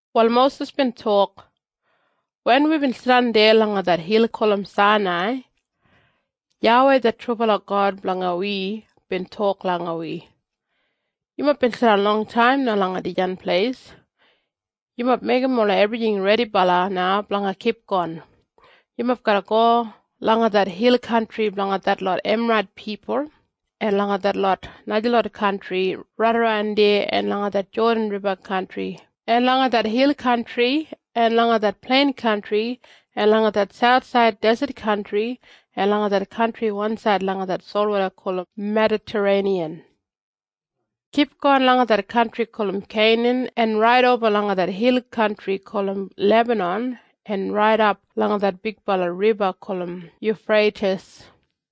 Wal Mosis bin tok, “Wen wibin jidan deya langa det hil gulum Sainai, YAWEI det trubala God blanga wi bin tok langa wi, ‘Yumob bin jidan longtaim na langa dijan pleis. Yumob meigim ola ebrijing redibala na blanga kipgon. Yumob garra go langa det hil kantri blanga detlot Emarait pipul en langa detlot najalot kantri raidaran deya en langa det Jodan Riba kantri en langa det hil kantri en langa det plein kantri en langa det sauthsaid deset kantri en langa det kantri wansaid langa det solwoda gulum Medatareiniyan. Kipgon langa det kantri gulum Keinan en raidoba langa det hil kantri gulum Lebanan en raidap langa det bigbala riba gulum Yufreitis.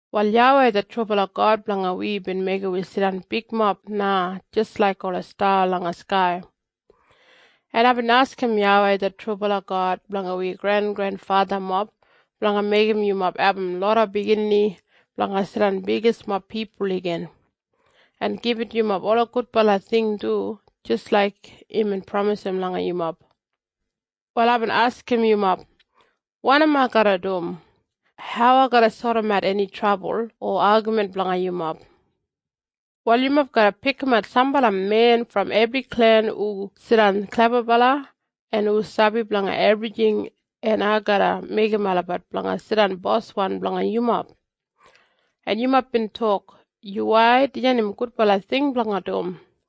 Wal YAWEI det trubala God blanga wi bin meigim wi jidan bigmob na jis laik ola sta langa skai. En aibin askim YAWEI det trubala God blanga wi grengrenfathamob blanga meigim yumob abum loda biginini blanga jidan bigismob pipul igin, en gibit yumob ola gudbala ting du jis laik imbin pramisim langa yumob. Wal aibin askim yumob, ‘Wanim ai garra dum? Hau ai garra sodimatbat eni trabul o agamin blanga yumob? Wal yumob garra pikimat sambala men brom ebri klen hu jidan klebabala en hu sabi blanga ebrijing en ai garra meigim olabat blanga jidan boswan blanga yumob.’ En yumob bin tok, ‘Yuwai, dijan im gudbala ting blanga dum.’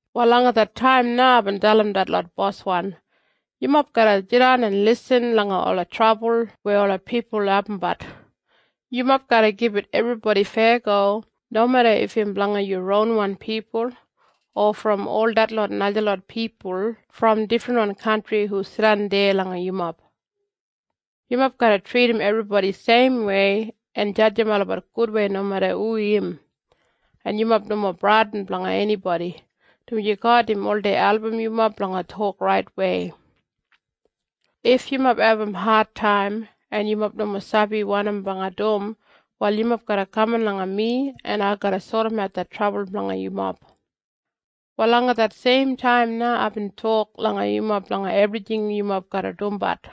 “Wal langa det taim na aibin dalim detlot boswan, ‘Yumob garra jidan en lisin langa ola trabul weya ola pipul abumbat. Yumob garra gibit ebribodi feyago nomeda if im blanga yu ronwan pipul, o brom ol detlot najalot pipul brom difrinwan kantri hu jidan deya langa yumob. Yumob garra tridim ebribodi seimwei en jadjim olabat gudwei nomeda hu im. En yumob nomo bradin blanga enibodi, dumaji God im oldei album yumob blanga tok raitwei. If yumob abum adtaim en yumob nomo sabi wanim blanga dum wal yumob garra kaman langa mi en ai garra sodimat det trabul blanga yumob.’ Wal langa det seim taim na aibin tok langa yumob blanga ebrijing yumob garra dumbat.”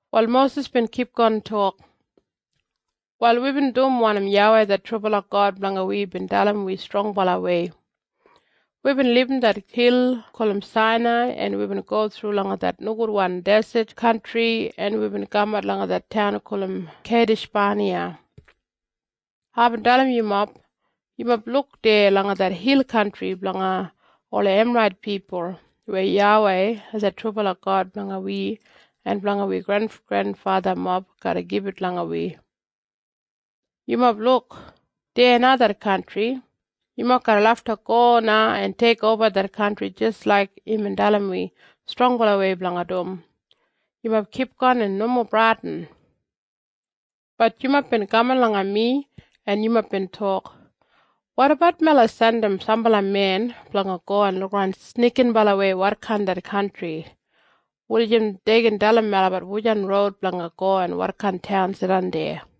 Wal Mosis bin kipgon tok, “Wal wibin dum wanim YAWEI det trubala God blanga wi bin dalim wi strongbalawei. Wibin libum det hil gulum Sainai en wibin go thru langa det nogudwan deset kantri en wibin kamat langa det taun gulum Keidishbaniya. Aibin dalim yumob, ‘Yumob luk deya langa det hil kantri blanga ola Emarait pipul weya YAWEI det trubala God blanga wi en blanga wi grengrenfathamob garra gibit langa wi. Yumob luk! Deya na det kantri. Yumob garra lafta go na en teikoba det kantri jis laik imbin dalim wi strongbalawei blanga dum. Yumob kipgon en nomo bradin.’ “Bat yumob bin kaman langa mi en yumob bin tok, ‘Wotabat melabat jandim sambala men blanga go en lukaran snikinbalawei wotkain det kantri, wulijim dei gin dalim melabat wujan roud blanga go en wotkain taun jidan deya.’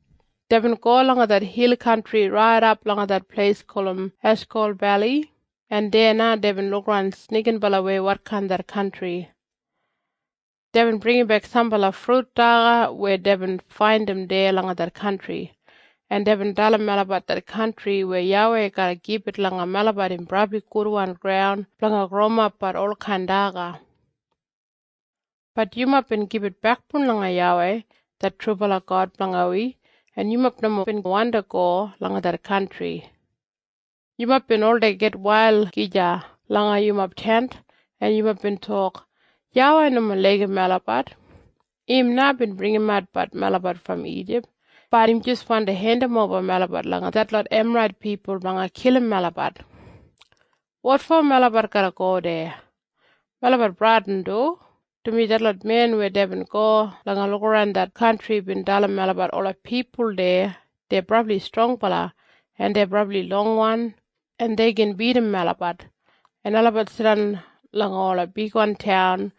Deibin go langa det hil kantri raidap langa det pleis gulum Eshkol Beli en deya na deibin lukaran snikinbalawei wotkain det kantri. Deibin bringimbek sambala frut daga weya deibin faindim deya langa det kantri. En deibin dalim melabat det kantri weya YAWEI garra gibit langa melabat im brabli gudwan graun blanga growimapbat olkain daga. “Bat yumob bin gibit bekboun langa YAWEI det trubala God blanga wi, en yumob nomo bin wandi go langa det kantri. Yumob bin oldei gitwail gija langa yumob tent, en yumob bin tok, ‘YAWEI nomo laigim melabat. Im na bin bringimat melabat brom Ijip, bat im jis wandi hendimoba melabat langa detlot Emarait pipul blanga kilim melabat. Wotfo melabat garra go deya? Melabat bradin du, dumaji detlot men weya deibin go blanga lukaran det kantri bin dalim melabat ola pipul deya dei brabli strongbala en dei brabli longwan, en dei gin bidim melabat, en olabat jidan langa ola bigwan taun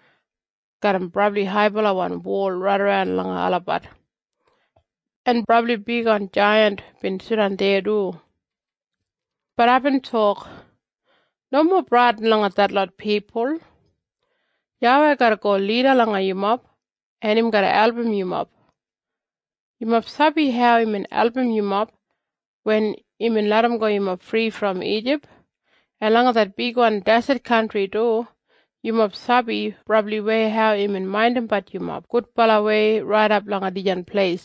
garram brabli haibalawan wol raidaran langa olabat. En brabli bigwan jaiyant bin jidan deya du.’ “Bat aibin tok, ‘Nomo bradin langa detlot pipul. YAWEI garra go lida langa yumob en im garra album yumob. Yumob sabi hau imbin album yumob wen imbin larramgo yumob fri brom Ijip, en langa det bigwan deset kantri du. Yumob sabi brabliwei hau imbin maindimbat yumob gudbalawei raidap langa dijan pleis,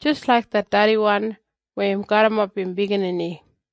jis laik det dediwan weya im garrimapbat im biginini.’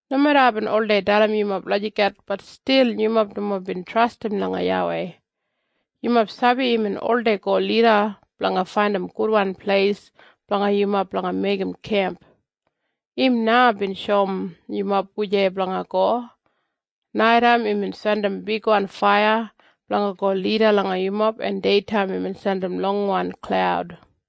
Nomeda aibin oldei dalim yumob lagijat bat stil yumob nomo bin trastim langa YAWEI. Yumob sabi imbin oldei go lida blanga faindim gudwan pleis blanga yumob blanga meigim kemp. Im na bin shoum yumob wujei blanga go. Naitaim imbin jandim bigwan faiya blanga go lida langa yumob en deitaim imbin jandim longwan klaud.”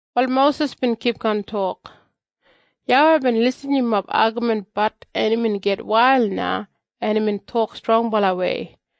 Wal Mosis bin kipgon tok, “YAWEI bin irrim yumob agaminbat en imbin gitwail na en imbin tok strongbalawei.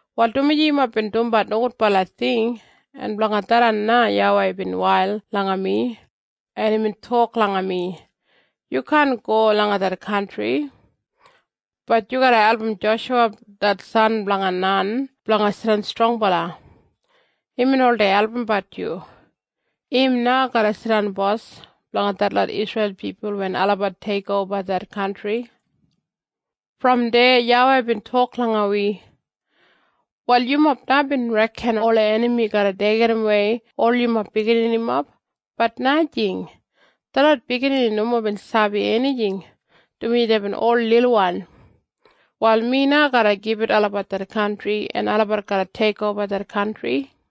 “Wal dumaji yumob bin dumbat nogudbala ting, en blanga tharran na YAWEI bin wail langa mi, en imbin tok langa mi, ‘Yu kaan go langa det kantri. Bat yu garra album Joshuwa det san blanga Nan blanga jidan strongbala. Imbin oldei albumbat yu. Im na garra jidan bos blanga detlot Isreil pipul wen olabat teikoba det kantri.’ “Brom deya YAWEI bin tok langa wi, ‘Wal yumob na bin reken ola enami garra deigimwei ol yumob bigininimob, bat najing. Detlot biginini nomo bin sabi enijing, dumaji deibin ol lilwan. Wal mi na garra gibit olabat det kantri en olabat garra teikoba det kantri.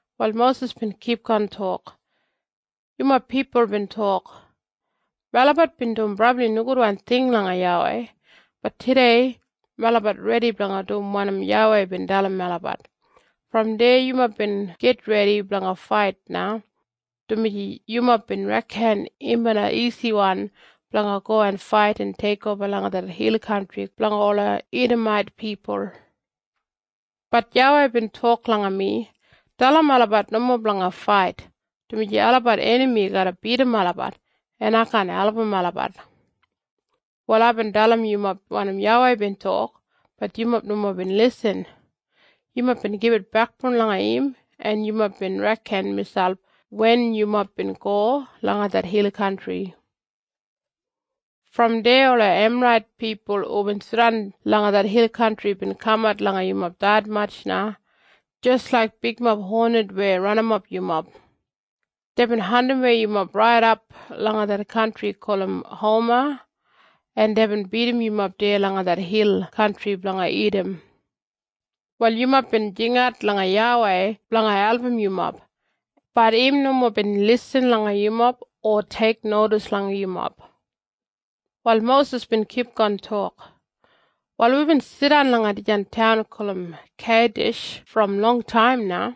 Wal Mosis bin kipgon tok, “Yumob pipul bin tok, ‘Melabat bin dum brabli nogudwan ting langa YAWEI. Bat tudei melabat redi blanga dum wanim YAWEI bin dalim melabat.’ Brom deya yumob bin gitredi blanga fait na, dumaji yumob bin reken im bina isiwan blanga go en fait en teikoba langa det hil kantri blanga ola Idamait pipul. “Bat YAWEI bin tok langa mi, ‘Dalim olabat nomo blanga fait, dumaji olabat enami garra bidim olabat, en ai kaan album olabat.’ Wal aibin dalim yumob wanim YAWEI bin tok, bat yumob nomo bin lisin. Yumob bin gibit bekboun langa im en yumob bin reken miselp wen yumob bin go langa det hil kantri. “Brom deya ola Emarait pipul hubin jidan langa det hil kantri bin kamat langa yumob detmatj na, jis laik bigmob honet weya ranimap yumob. Deibin andimwei yumob raidap langa det kantri gulum Homa en deibin bidim yumob deya langa det hil kantri blanga Idam. Wal yumob bin jingat langa YAWEI blanga album yumob, bat im nomo bin lisin langa yumob o teiknodis langa yumob.” Wal Mosis bin kipgon tok, “Wal wibin jidan langa dijan taun gulum Keidish brom longtaim na.